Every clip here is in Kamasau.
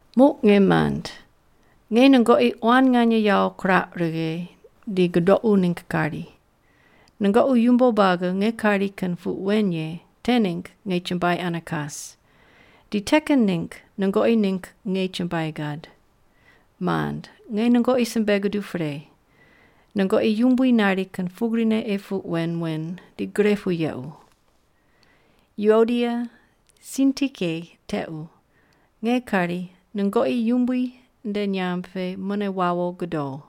Muq nge mand, nge nungoqi quan nganye yawo kirauq righe di gudoqu ningg kari. Nungoqi yumbo buagi nge kari kin puq wen ye te ningg nge chumbuai ane kas, di te kin ningg nungoqi ningg nge chumbuai gad. Mand nge nungoqi simbe guduq pre, nungoqi Yumbui nari kin pugrine ei puq wen wen di gre pu yequ. Yuodia Sintike tequ nge kari nungoqi Yumbui nde nyamb pe mune wawo gudo.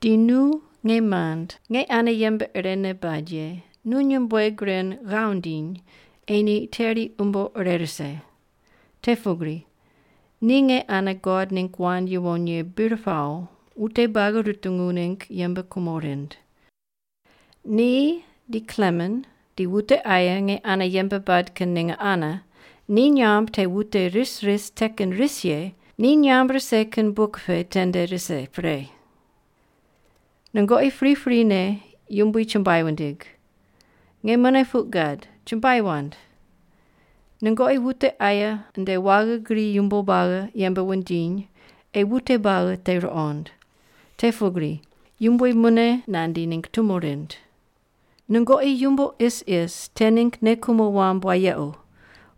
Di nu nge mand nge ane yembe irene bad ye nu nyumbueg ren ghav ndiny ei ni teri umbo ire rise. Te pugri ni nge ane God ningg wand yuwon ye bir pawo wute buagi rutungu ningg yembe kumo rind. Ni di Klemen di wute aye nge ane yembe bad kin ninge ane ni nyamb te wute ris ris te kin ris ye ni nyamb rise kin buk pe tende rise pre. Nungoqi priprine Yumbui chumbuai wundig. Nge mune puq gad: Chumbuai wand! Nungoqi wute aye nde waghi gri yumbo buagi yembe wundiny ei wute buagi te ruqond. Te pugri Yumbui mune nandi ningg tumo rind. Nungoqi yumbo isis te ningg nei kumo wamb wayequ,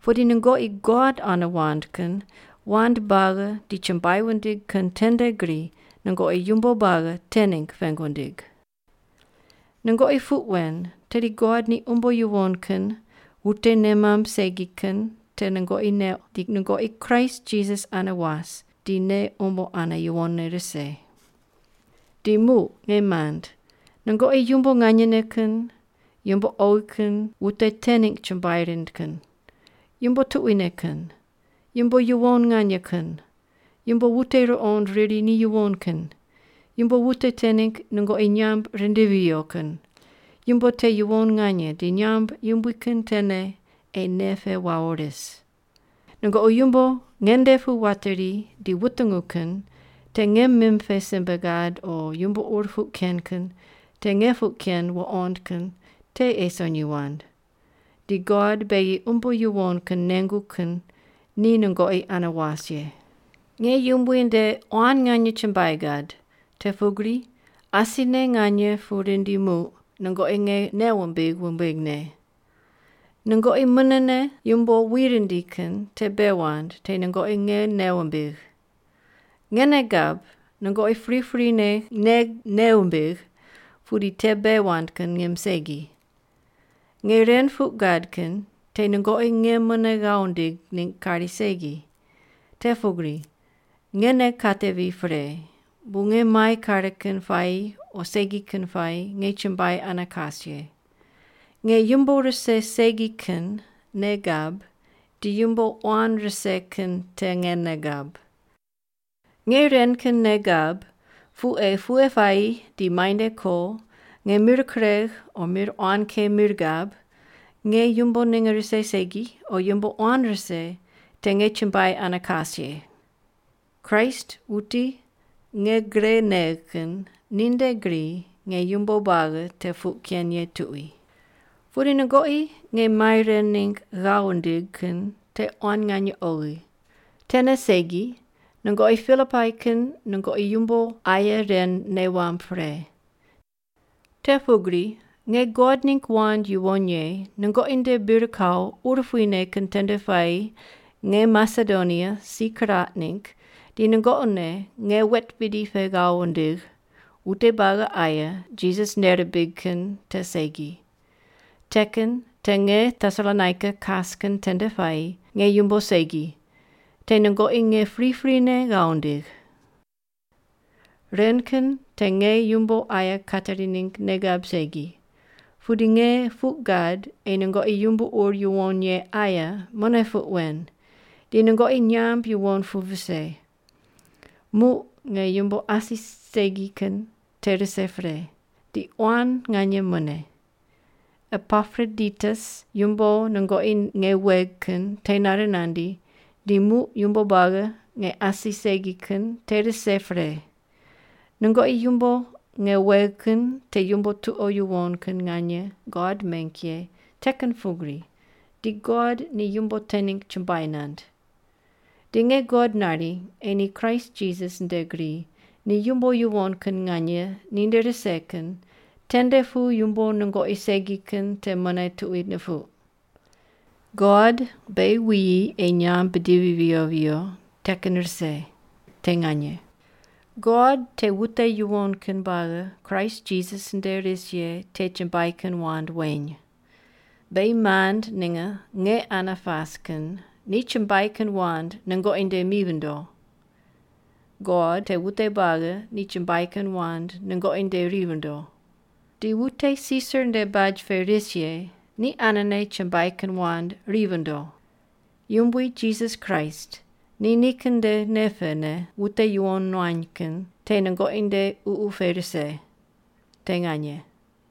pudi nungoqi God ane wand kin wand buagi di chumbuai wundig kin tende gri nungoqi yumbo buagi te ningg pengu wundig. Nungoqi puq wen tedi God ni umbo yuwon kin wute nei mamb segi kin te nungoqi neuq di nungoqi Kraist Jisas ane was di nei umbo ane yuwonne rise. Di muq, nge mand, nungoqi yumbo nganyene kin, yumbo oghi kin wute te ningg chumbuai rind kin, yumbo tuquine kin, yumbo yuwon nganye kin, yumbo wute ruqond riri ni yuwon kin, yumbo wute te ningg nungoqi nyamb rindivi viyo kin, yumbo te yuwon nganye di nyamb yumbui kin tene ei nei pe wawo ris. Nungoqi yumbo nge nde pu wateri di wutungu kin te nge mim pe simbe gad o yumbo ur puq ken kin te nge puq ken wuqond kin te ei sonyi wand. Di God beghi umbo yuwon kin nengu kin ni nungoqi ane was ye. Nge Yumbui nde quan nganye chumbuai gad, te pugri asine nganye pu rindi muq nungoqi nge nei wumbigh wumbighne. Nungoqi munene yumbo wi rindi kin te bei wand te nungoqi nge nei wumbigh. Nge nei gab nungoqi priprine nge nei wumbigh pudi te bei wand kin ngim segi. Nge ren puq gad kin te nungoqi nge mune ghav wundigh ningg kari segi, te pugri nge nei katevi pre bu nge mai kare kin puayi o segi kin puayi nge chumbuai ane kas ye. Nge yumbo rise segi kin nei gab di yumbo quan rise kin te nge nei gab. Nge ren kin nei gab pu ei pughe puayi di muainde ko, nge mir kuregh o mir quan ke mir gab, nge yumbo ninge rise segi o yumbo quan rise te nge chumbuai ane kas ye. Kraist wuti nge gre negh kin ninde gri nge yumbo buagi te puq ken ye tuqui. Pudi nungoqi nge mai ren ningg ghav wundigh kin te quan nganye oghi. Tene segi nungoqi Pilipai kin nungoqi yumbo aye ren nei wamb pre. Te pugri nge God ningg wand yuwon ye nungoqi nde bir kawo urupuine kin tende puayi nge Masedonia si kiraq ningg di nungoqi ne nge wet bidi pe ghav wundigh, wute buagi aye Jisas nei rimbig kin te segi. Te kin te nge Tesalonaika kas kin tende puayi nge yumbo segi, te nungoqi nge priprine ghav wundigh. Ren kin te nge yumbo aye kateri ningg nei gab segi, pudi nge puq gad ei nungoqi yumbo ur yuwon ye aye mune puq wen, di nungoqi nyamb yuwon pu vise. Muq nge yumbo asi segi kin te rise pre, di quan nganye mune. Epaproditus yumbo nungoqi nge wegh kin te nare nandi di muq yumbo buagi nge asi segi kin te rise pre. Nungoqi yumbo nge wegh kin te yumbo tuqo yuwon kin nganye God meng ye te kin pugri di God ni yumbo te ningg chumbuai nand. Di nge God nari ei ni Kraist Jisas nde gri ni yumbo yuwon kin nganye ninde rise kin tende pu yumbo nungoqi segi kin te mune tuqui nupuq. God beghi wuyi ei nyamb bidivi viyo viyo te kin rise. Te nganye. God te wute yuwon kin buagi Kraist Jisas nde ris ye te chumbuai kin wand weny. Beghi mand ninge nge ane pas kin ni chumbuai kin wand nungoqi nde mi vindo. God te wute buagi ni chumbuai kin wand nungoqi nde ri vindo. Di wute Sisar nde baj pe ris ye ni anene chumbuai kin wand ri vindo. Yumbui Jisas Kraist ni nikin nde nei pene wute yuwon nuany kin te nungoqi nde ququ pe rise. Te nganye.